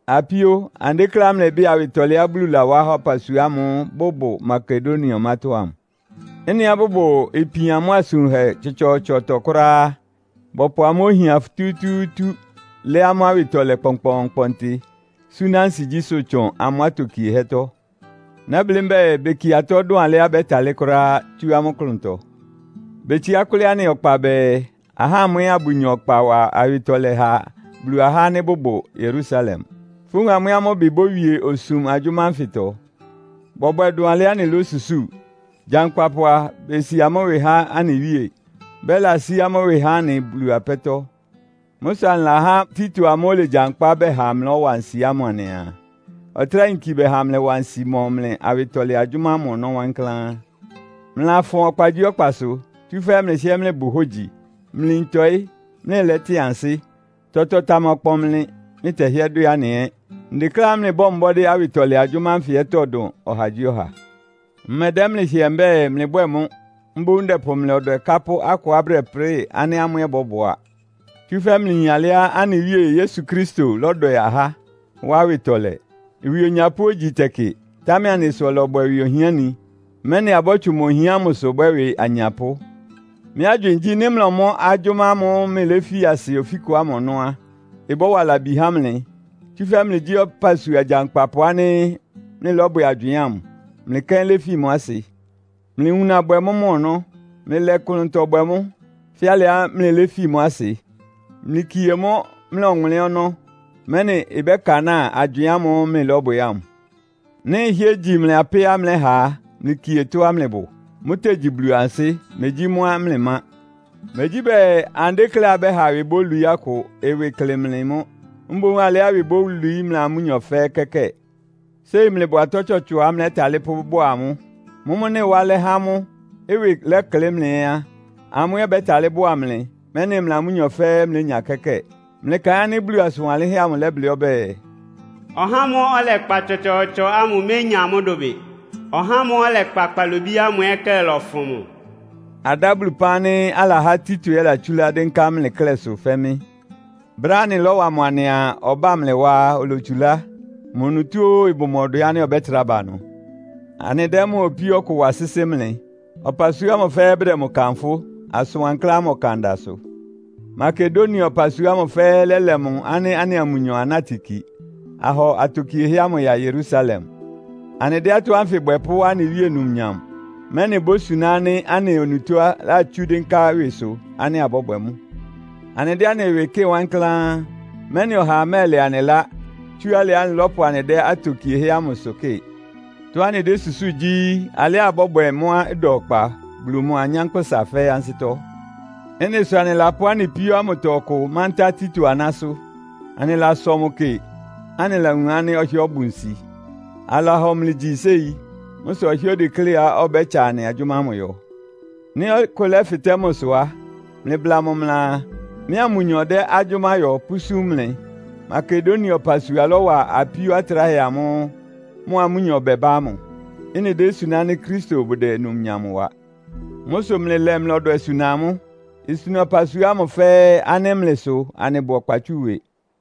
Apíó, anɩdékléá mlɩbɩ́ɩ awɩtɔlɛá Bulu lawá há ɔpasua ámʋ́ʋ́ bʋbʋ Makedonia ɔmátɔ́ ámʋ. Ɩ́nɩá bʋbʋ ipian mʋ́a asʋn wunhɛ tsɔtsɔɔtsɔtɔ kʋ́ráá á, bɔpʋ amʋ́ ohian futútúútú lɛ́ amʋ́ awɩtɔlɛ kpɔnkpɔɔnkpɔntɩ súná ansigyísʋ́ tsʋn amʋ́ atokiehɛ́tɔ́. Nɛ́blɩ́ mbɛ́ɛ, bekie atɔ́ dʋn alɩá bɛ́talɩ́ kʋ́ráá, tsú amʋ́ klʋntɔ. Betsiá kʋ́lɩ́ anɩ ɔkpa bɛɛ, ahá amʋ́ ɛ́ abʋnya ɔkpa wa awɩtɔlɛ ha Bulu ahá ánɩ́ bʋbʋ Yerusalem. Fówun amʋ́ ɛ́ amʋ́ ɩbɩ bówie osum agyʋ́má ánfɩtɔ. Bɔbwɛ dʋn alɩá anɩlósusúu. Gyankpapʋ a, besi amʋ́ ɩwɩ há anɩ Wíe, bɛlasí amʋ́ ɩwɩ há anɩ Bulu apɛ́tɔ́. Mʋ́ sʋ anɩlahá Tito amʋ́ʋ́ olegyankpá bɛha mlɩlɔ́wa nsi ámʋ anɩaa, ɔtráa yinki bɛha amlɩwa nsi mɔ mlɩ awɩtɔlɛ agyʋ́má ámʋ ɔnɔ́ wankláán. Mlɩlafʋn ɔkpagyíɔkpasʋ, tsúfɛ́ mlɩhɩ́ɛ́ mlɩbʋ hógyi, mlɩyin tɔɩ́, mlɩlɛ́tɩn ansɩ́. Tɔtɔ tamakpɔn mlɩ, mlɩtɛhɩ́ɛ́ dwɛ́ anɩ ɛ́. Ndekléá mlɩbɔ́ɔ mbɔ́dɩ́ awɩtɔlɛ agyʋ́má ánfɩ ɛ́tɔ́ dʋn ɔhagyíɔha. Mmɛdɛ́ mlɩ hɩɛ mbɛ́ɛ, mlɩbwɛ́ɛ mʋ́. Mboún ndɛpʋ mlɩ ɔdwɛ kápʋ́ akʋá bʋdɛprɩ́ɩ ánɩ́ amʋ́ ɛ́ bɔ́bʋá. Tsúfɛ́ mlɩyin alɩá anɩ Wíe Yesu Kristo lɔ́dwɛ ahá, wá awɩtɔlɛ. Ɩwɩ onyapʋ́ ogyi tɛkɩ, támɛ anɩ sʋ ɔlɔbwɛ ɩwɩ ohiáni, mɛ́nɩ abɔ́tsʋn mʋ ohian ámʋsʋ bwɛ́ ɩwɩ anyapʋ́. Mɩ́ agywɩɩn gyí, nɩ́ mlɔmɔ́ agyʋ́má ámʋ́ʋ́ mlɩléfi asɩ ofíkʋ ámʋ ɔnɔ́ á, ɩbɔ́wa labi há mlɩ. Tsúfɛ́ mlɩgyí ɔpasua gyankpapʋ ánɩ́ mlɩlɔ́bwɛ agywɩɩn ámʋ, mlɩ kɛ́n léfi mʋ́ asɩ. Mlɩwuna bwɛ mʋ́ mɔ ɔnɔ́. Mlɩlɛ ɩklʋntɔ bwɛ mʋ́, fɛ́ alɩá mlɩléfi mʋ́ asɩ. Mlɩkie mʋ́ mlɩ ɔwʋnlɩ́n ɔnɔ́, mɛ́nɩ ɩbɛ́kanáa agywɩɩn ámʋ́ʋ́ mlɩlɔ́bwɛ ámʋ. Nɩ́ ɩhɩ́ɛ́ igyi mlɩ apɛ́á mlɛ́ha á, mlɩkie tɔ́á mlɩbʋ. Mʋ́tegyi Bulu ansɩ́, megyí mʋ́á mlɩmá. Megyí bɛɛ, anɩdékléá abɛ́ha ɩwɩ bólwií akʋ, ɩwɩ ɩklɩ mlɩ mʋ́; mboún alɩá ɩwɩ bólwií mlɩa amʋ́nyɔ fɛ́ɛ́ kɛ́kɛ́ɛ. Séi mlɩbʋ atɔ́ tsɔtsɔá mlɛ́talɩ́ pʋ́bʋ́a amʋ́. Mʋ́mʋ́ nɩ́ ɩwá alɛ́ há amʋ́, ɩwɩ lɛklɩ́ mlɩ ɛ́ á, amʋ́ ɛ́ bɛ́talɩ́ bʋ́a mlɩ, mɛ́nɩ mlɩa amʋ́nyɔ fɛ́ɛ́ mlénya kɛ́kɛ́ɛ. Mlɩkaɩn ánɩ́ Bulu asʋn wanlɩ́nhɛ́ amʋ lɛ́blɩ́ ɔbɛ́ɛ, “Ɔhá ámʋ́ʋ́ ɔlɛkpa tsɔtsɔɔtsɔ ámʋ ménya mʋ́ dʋbɩ. Ɔhá ámʋ́ʋ́ ɔlɛkpa kpalobí ámʋ ɛ́ klɛ́ lɔfʋn mʋ.” Adá Bulu ɩpán ánɩ́ alahá Tito ɛ́ latsúlá dɩ́nká mlɩ klɛ́sʋ fɛ́ mɩ́. Brɛ́á anɩlɔ́wa mʋ anɩaa ɔbá mlɩ wá á, olotsulá. Mʋ onutó óó, ɩbʋ mʋ ɔdwɛ ánɩ́ ɔbɛ́trá ba ɩnʋ. Anɩdɛ́ mʋa opíó ɔkʋ wa sɩ́sɩ́ mlɩ. Ɔpasua ámʋ fɛ́ɛ́ bʋdɛ mʋ kanfʋ́, asʋn wankláán ámʋ ɔkan da sʋ. Makedonia ɔpasua ámʋ fɛ́ɛ́ lɛ́lɛ mʋ ánɩ́ anɩa mʋnyɔ anátɩ ki, ahɔ atokiehɛ́ ámʋ ya Yerusalem. Anɩdɛ́ atɔ́ ánfɩ bwɛ pʋ́wá anɩ Wíe numnyam, mɛ́nɩ ibósuná ánɩ́ anɩ onutó latsú dɩ́nká ɩwɩsʋ ánɩ́ abɔ́bwɛ mʋ́. Anɩdɛ́ anɩ ɩwɩ kɩ́ɩ wankláán, mɛ́nɩ ɔhaa mɛ́ɛlɛ anɩ ɩlá, tsú alɩá anɩlɔ́pʋ anɩdɛ́ atokiehɛ́ ámʋsʋ kɩ́ɩ. Tɔ́á anɩdésusúu gyí, alɩá abɔ́bwɛ mʋ́á ɩda ɔkpa Bulu mʋa anyánkpʋ́sa fɛ́ɛ́ ansɩ́tɔ́. Ɩ́nɩ sʋ anɩlapʋ́ anɩ apíó ámʋtɔ ɔkʋ mántá Tito anásʋ́. Anɩlasɔ mʋ kɩ, anɩlawun ánɩ́ ɔhɩ́ɛ́ ɔbʋ nsi. Alahɔ mlɩ gyi séi. Mʋ́ sʋ ɔhɩ́ɛ́ odekléá ɔbɛ́tsa anɩ agyʋ́má ámʋ yɔ. Nɩ́ ɔkʋ lɛ́fɩtɛ́ mʋsʋ á, mlɩbla mʋ mlɩaa, mɩ́a mʋnyɔ dɛ́ agyʋ́má yɔ pʋ́súm mlɩ. Makedonia ɔpasua lɔ́wa apíó atráhɛ amʋ́ʋ́ mʋa amʋ́nyɔ bɛbá ámʋ. Ɩ́nɩ désuná ánɩ́ Kristo bʋdɛ numnyam wa. Mʋ́ sʋ mlɩlɛ mlɩ ɔdwɛ suna amʋ́. Isuna ɔpasua ámʋ fɛ́ɛ́ ánɩ́ mlɩ sʋ anɩbʋ ɔkpa tsú ɩwɩ.